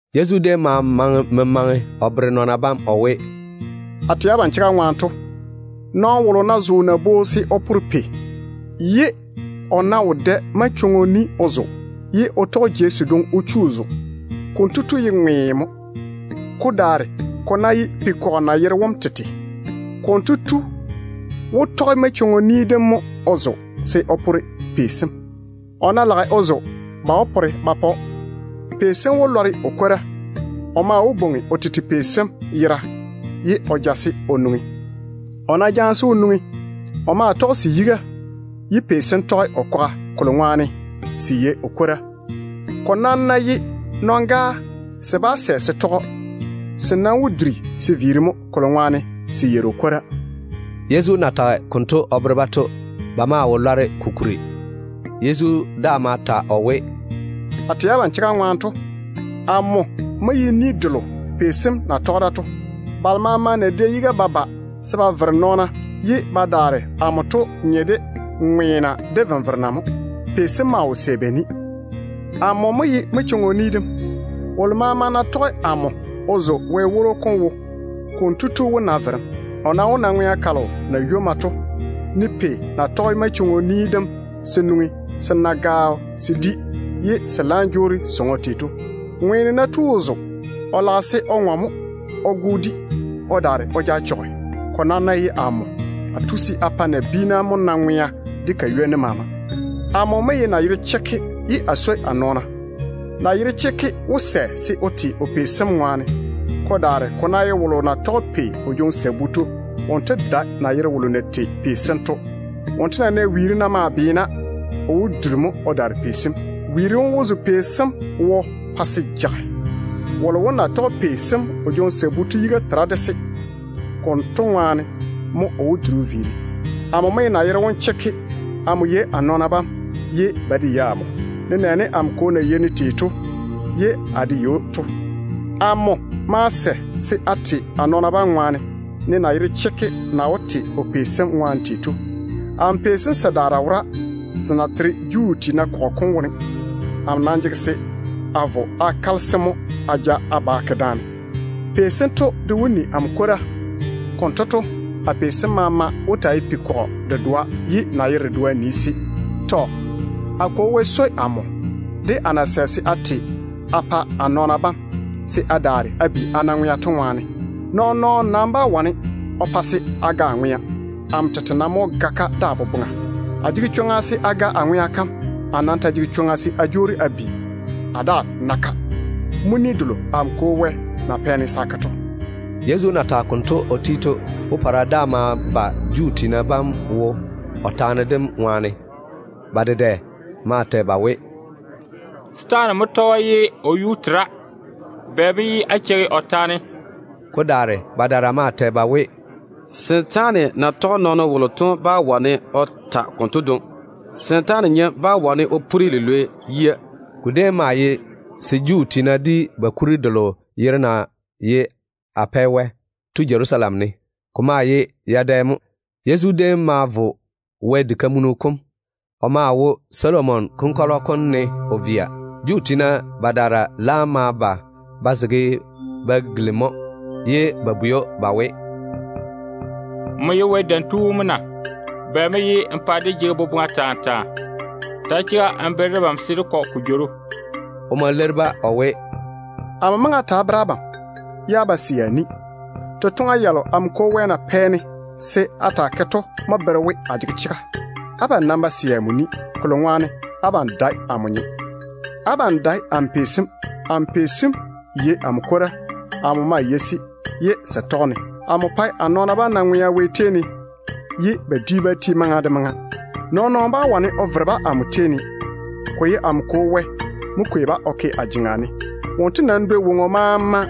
Yezu déem ma maŋe memaŋe o bere nɔɔna bam o we, “A tɛ abam chega ŋwaane to, nɔɔno wolo ná zo nabwoo se o pore pei, ye o ná wo dɛ manchwoŋo ni o zo ye o ná tɔge jei sedwoŋi o chu ko wone, konto tu ye ŋweeno mo. Ko daare ko ná ye pei-kɔgɔ nayero wom tete, konto tu wó tɔge manchwoŋo ni dem mo o zo se o pore pei sem. O ná lage o zo, ba wó pore ba pa‑o. Pei sem wó lɔre o kwora. O maa wó bwoŋi o tete pei sem yera, ye o ja-se o nwoŋi. O ná jaane-se o nwoŋi, o maa tɔge se yiga, ye pei sem tɔge o kwaga, kolo ŋwaane se yei o kwora. Ko nam ná ye nɔn-gaa, se bá sɛ se tɔge‑o. Se nam wó duri se viiri mo, kolo ŋwaane se yeiri o kwora.” Yezu na mɛ memaŋe dem konto o bere-ba to, ba maa wo lɔre ko kuri. Yezu daa ma ta o we, “A tɛ abam chega ŋwaane to, amo mo ye ni delo pei sem na tɔge da to. Nayera balo maama na dɛ yiga ba ba ye ba lwoori amo to nye de ŋweena de venverena mo. Pei sem maa wo sɛ ba ni. Amo mo ye manchwoŋo ni dem. Wolo maama ná tɔge amo baŋa o zo Wɛ woro kom wo, konto tu wó na verem. O nam wó na ŋwea kalo na ywomma to, ne pei na tɔge manchwoŋo ni dem se nwoŋi se di ye se laam jwoori se zoore tei to. Ŋweeno ná tu o zo, o lage se o ŋɔ mo o go o di o daare o ja o chɔge. Ko nam ná ye amo, a tu se a pa nabiina mo na ŋwea de ka ywoni maama. Amo mo ye nayero chekke ye a swoi a nɔɔna. Nayero chekke wó sɛ se o te o pei sem ŋwaane. Ko daare ko ná ye wolo na yere pei sem o jwoŋi sabu to, wonto dae nayero wolo na tei pei sem to. Wonto ná nɛ nywoŋ-kura na maa beena, o wó duri mo o daare pei sem. Nywoŋ-kura kam maa wó zo pei sem wo pa se jage. Wolo wom na tɔge pei sem o jwoŋi sabu to yiga tera se wone. Konto ŋwaane mo o wó duri o daare-se. Amo mo ye nayero wom chekke. Amo me de a nɔɔna bam, ye ba de me de amo, nenɛɛne amo Kwo na me de amo, ye amo de me ded‑o tei to. Amo maa sɛ se a te a nɔɔna bam ŋwaane, ne nayero chekke na wó te o pei sem ŋwaane tei to. Amo pei sem sedaara wora, se na tere Juu tiina kɔgɔ kom wone. Amo nam jege se a vo a kale-se mo a ja ba a ke daane. Pei sento de wó ni amo kwora. Konto to, a pei sem maama wó taa ye pei-kɔgɔ dedoa ye nayero dedoa nii-se. A Kwo Wɛ swoi amo, de a na sɛ se a te a pa a nɔɔna bam, se a daare a bi a na ŋwea to ŋwaane. Nɔɔn-nɔɔno nam bá wane o pa a ga a ŋwea. Amo tete nam mo wó kwei-ka a tiŋi dáa ne de a boboŋa. A jege chwoŋa se a pa a ŋwea kam jei. A nam ta jege chwoŋa se a jwoori a bi a daa na-ka. Mo ni delo amo Kwo na pɛ-ne se a ke to.” Yezu na tage konto o ti to, popɔra daa ma ba Juu tiina bam wo o taane dem ŋwaane. Ba dedɛ maa tɛ ba we, “Setaane mo tɔge‑o pa se o yuu tera. Bɛ mo ye á cheigi o taane?” Ko daare badaara maa tɛ ba we, “Setaane na tɔge nɔɔno wolo to bá wane o ta taana yanto dwoŋi. Setaane nyem bá wane o puri lilwei yia.” Ko déem ma yi se Juu tiina di ba kuri delo yere na ye ‘Apɛwɛ’ to Jerusalem ne. Ko maa ye yadɛ. Yezu déem ma vo Wɛ diga kam. O maa wo Solomon konkɔlɔ kom ne o kaaga. Juu tiina badaara laam ma ba ba zege ba gilimi‑o, ye ba bwei‑o ba we, “Nmo ye Wɛ Dam Tu wom mo na? Bɛ mo ye n pa dé jege boboŋa taa taa? Ta chega n bere debam se dé kɔ ko jworo.” O ma leiri-ba o we, “Amo maŋe a ta a bere abam, ye á ba sɛ a ni. Totoŋa yalo amo Kwo Wɛ na pɛ-ne se a taa ke to mo bere we a jege chega. Abam nam ba sɛ amo ni, kolo ŋwaane abam dae amo nyem. Abam dae amo pei sem. Amo pei sem yei amo kwora. Amo maa me de-se, ye se tɔge-ne. Amo pae a nɔɔna bam na ŋwea Wɛ tei ne mo, ye ba dwi bá ti maŋa de maŋa. Nɔɔn-nɔɔno bá wane o vere-ba amo tei ne. Ko ye amo Kwo Wɛ mo kwei-ba o ke a jeŋa ne. Wonto nam dwoi woŋo maama.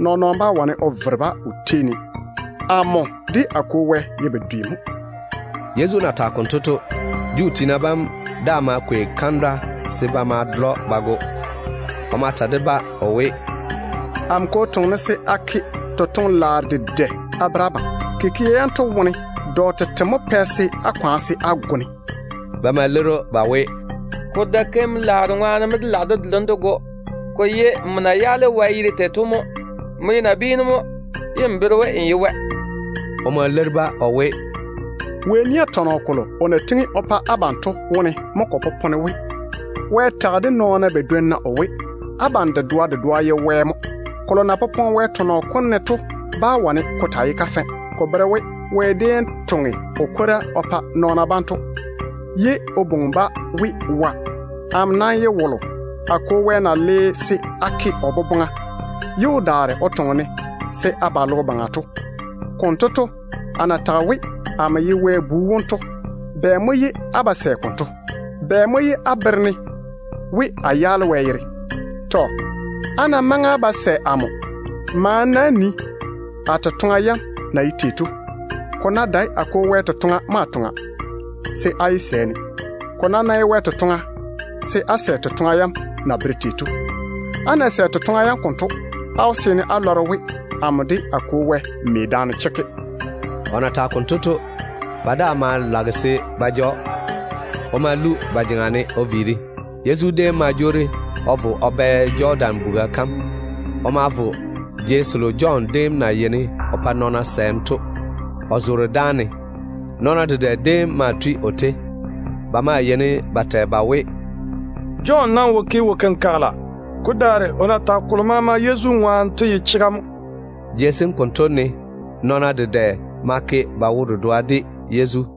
Nɔɔn-nɔɔno bá wane o vere-ba o tei ne. Amo de a Kwo Wɛ ye bedwe mo.” Yezu na tage konto to, Juu tiina bam daa ma kwei kandwa se ba ma ba dole‑o ba go. O ma ta de-ba o we, “Amo Kwo toŋe-ne se a ke totoŋ-laaro dedɛ a bere abam. Totoŋa yanto wone dɔ tete mo pɛ se á kwaane se á go-ne?” Ba ma leiri‑o ba we, “Ko dae keim-laaro ŋwaane mo dé lage dé dole‑m dé go. Ko ye nmo na twe Wɛ yere tei to mo. Nmo ye nabiinu mo, ye n bere we n ye Wɛ.” O ma leiri-ba o we, “Wɛ nia tɔnɔ kolo o na tiŋi o pa abam to wone mo ko popone we, Wɛ tage de nɔɔna badwonna o we, ‘Abam ye wa mo.’ Kolo na popone Wɛ tɔnɔ kom ne to bá wane ko taa ye kafɛ. Ko bere we Wɛ déem toŋe o kwora o pa nɔɔna bam konto, ye o bwoŋi-ba we, ‘wa’. Amo nam ye wolo a Kwo Wɛ na le se a ke o boboŋa, ye o daare o toŋe-ne se a ba logo baŋa to mo. Konto to, a na tage we amo ye Wɛ Bu wom to, bɛ mo ye á ba sɛ konto? Bɛ mo ye á bere-ne we a twe Wɛ yere? Abam ná maŋe á ba sɛ amo, maane-na á nii a totoŋa yam na ye tei to. Ko ná dae a Kwo Wɛ totoŋa mo a toŋa, se á yé sɛ-ne. Ko nam ná ye Wɛ totoŋa, se á sɛ totoŋa yam na bere tei to. Á ná sɛ totoŋa yam konto, á wó seene á lɔre we amo de a Kwo Wɛ me daane chekke.” O na tage konto to, ba daa maa lage se ba ja‑o. O ma lu ba jeŋa ne o viiri. Yezu déem ma jwoori o vo o bɛ Jɔdan buga kam. O ma vo jei selo Jɔn déem na yeini o pa nɔɔna sɛɛm to, o zoore dáane. Nɔɔna dedɛ déem maa tui o tei. Ba maa yeini ba tɛ ba we, “Jɔn nam wo ke wo-kenkagele, de dedoa de. Ko daare o na tage kolo maama Yezu ŋwaane to ye chega mo.” Jei sem konto ne nɔɔna dedɛ ma ke ba wo-dedoa de Yezu.